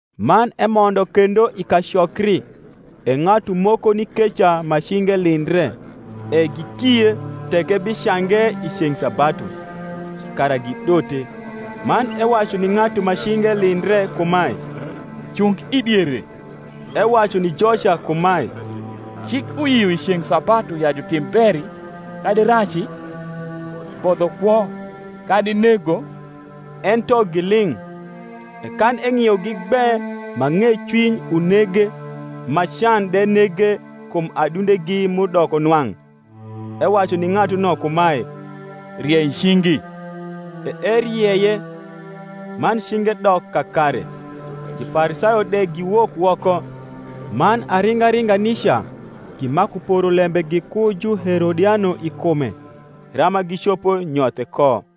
Man emondo kendo i kacokri: e ng’atu moko ni keca ma cinge lindre. E gikie, tek ebicange i ceng’ sabatu: kara gidote. Man ewacu ni ng’atu ma cinge lindre kumae, Cung i diere. Ewacu ni joca kumae, Cik uyio i ceng’ sabatu ya jutim beri, kadi raci? bodho kwo, kadi nego? Ento giling’. E kan eng’iogi gbe ma ng’ecwiny unege, ma can de nege kum adundegi m’udoko nwang’, ewacu ni ng’atuno kumae, Riei cingi. E erieye; man cinge dok kakare. Jufarisayo de giwok woko, man aringa ringa nica gimaku poro lembe giku Juherodiano i kume, rama gicopo nyothe ko.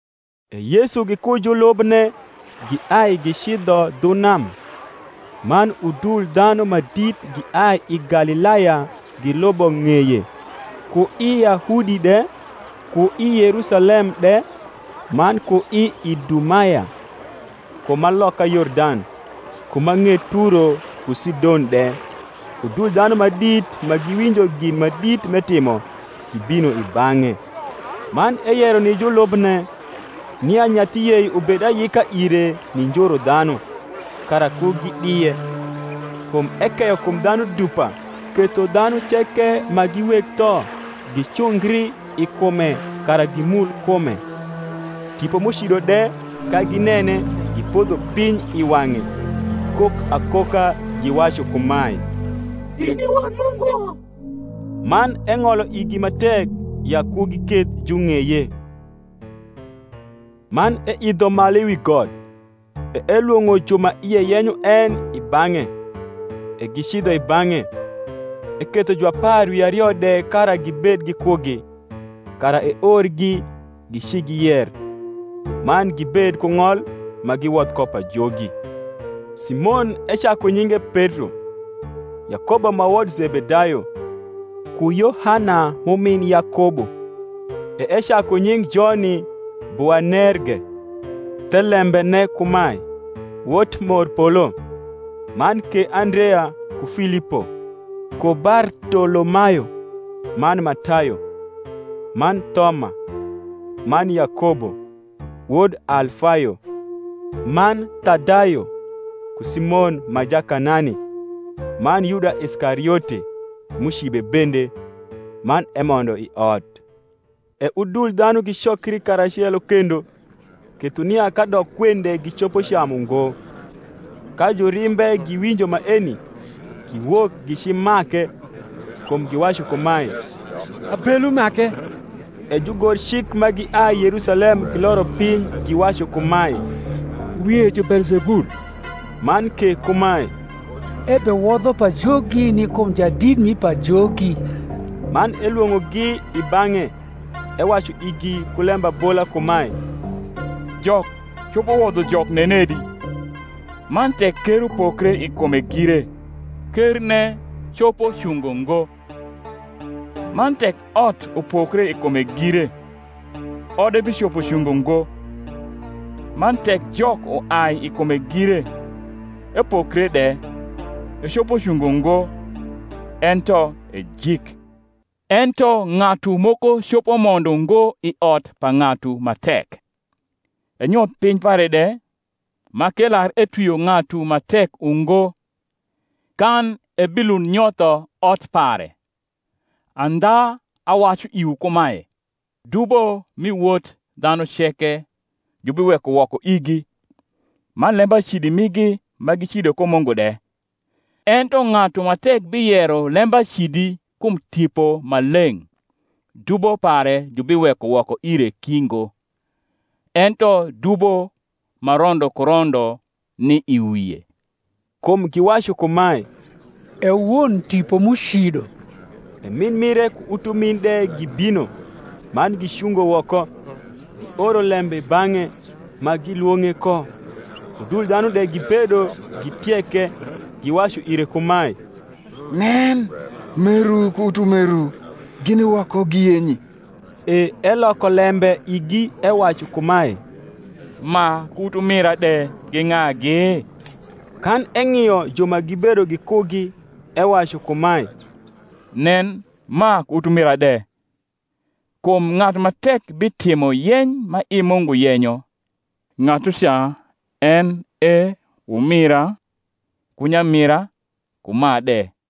E Yesu giku julubne giai gicidho dhu nam: man udul dhanu ma dit giai i Galilaya gilubo ng’eye; ku i Yahudi de, ku i Yerusalem de, man ku i Idumaya, ku ma loka Yordan, ku ma ng’et Turo ku Sidon de, udul dhanu ma dit ma giwinjo gin ma dit m’etimo, gibino i bang’e. Man eyero ni julubne, nia nyathi yei ubed ayika ire ni njuru dhanu, kara ku gidie: kum ekeyo kum dhanu dupa; ketho dhanu ceke ma gi weg tho gicungri i kume kara gimul kume. Tipo m’ucido de, ka ginene, gipodho piny i wang’e, gikok akoka, giwacu kumae, In i Wod Mungu. Man eng’olo igi ma tek ya ku giketh jung’eye. Man eidho malu wi got, e elwong’o ju ma ie yenyo en i bang’e; e gicidho i bang’e. Eketho juapar wi ario de kara gibed gikugi, kara eorgi gicigiyer, man gibed ku ng’ol ma giwodh ko pajogi: Simon ecaku nyinge Petro; Yakobo ma wod Zebedayo, ku Yohana m’umin Yakobo; e ecaku nying’ joni Boanerge, thelembene kumae, Wot morpolo: man ke Andrea, ku Filipo, ku Bartolomayo, man Matayo, man Thoma, man Yakobo, wod Alfayo, man Thadayo, ku Simon ma Jakanani. man Yuda Iskariote, m’ucibe bende. Man emondo i ot. E udul dhanu gicokri karacelo kendo, ketho nia kadok kwen de gicopo camu ngo. Ka jurimbe giwinjo maeni, giwok gicimake: kum giwacu kumae, Abelu make. E jugorcik ma giai Yerusalem giloro piny giwacu kumae, Wie ju Beelzebul, man ke kumae, Ebewodho pajogi ni kum jadit mi pajogi. Man elwong’ogi i bang’e, ewacu igi ku lembabola kumae, Jok copo wodho Jok nenedi? Man tek ker upokre i kume gire, kerne copo cungo ngo. Man tek ot upokre i kume gire, ode bicopo cungo ngo. Man tek Jok uai i kume gire, epokre de, ecopo cungo ngo, ento ejik. Ento ng’atu moko copo mondo ngo i ot pa ng’atu ma tek, enyoth piny pare de, ma k’elar etwio ng’atu ma tek ungo; kan ebilund nyotho ot pare. Andha awacu iwu kumae, Dubo mi wot dhanu ceke, jubiweko woko igi, man lembacidi migi ma gicido ko Mungu de: ento ng’atu ma tek biyero lembacidi kum Tipo Maleng’ dubo pare jubiweko woko ire ki ngo, ento dubo ma rondo ku rondo ni i wie: kum giwacu kumae, E won tipo m’ucido. E min mire ku utumin de gibino; man gicungo woko, gioro lembe i bang’e, ma gilwong’e ko. Udul dhanu de gibedo gitieke; giwacu ire kumae, Nen, meru ku utumeru gini woko giyenyi. E eloko lembe igi ewacu kumae, Ma ku utumira de gi ng’agi? Kan eng’io ju ma gibedo gikugi, ewacu kumae, Nen, ma ku utumira de! Kum ng’atu ma tek bitimo yeny ma i Mungu yenyo, ng’atuca en e umira, ku nyamira, ku ma de.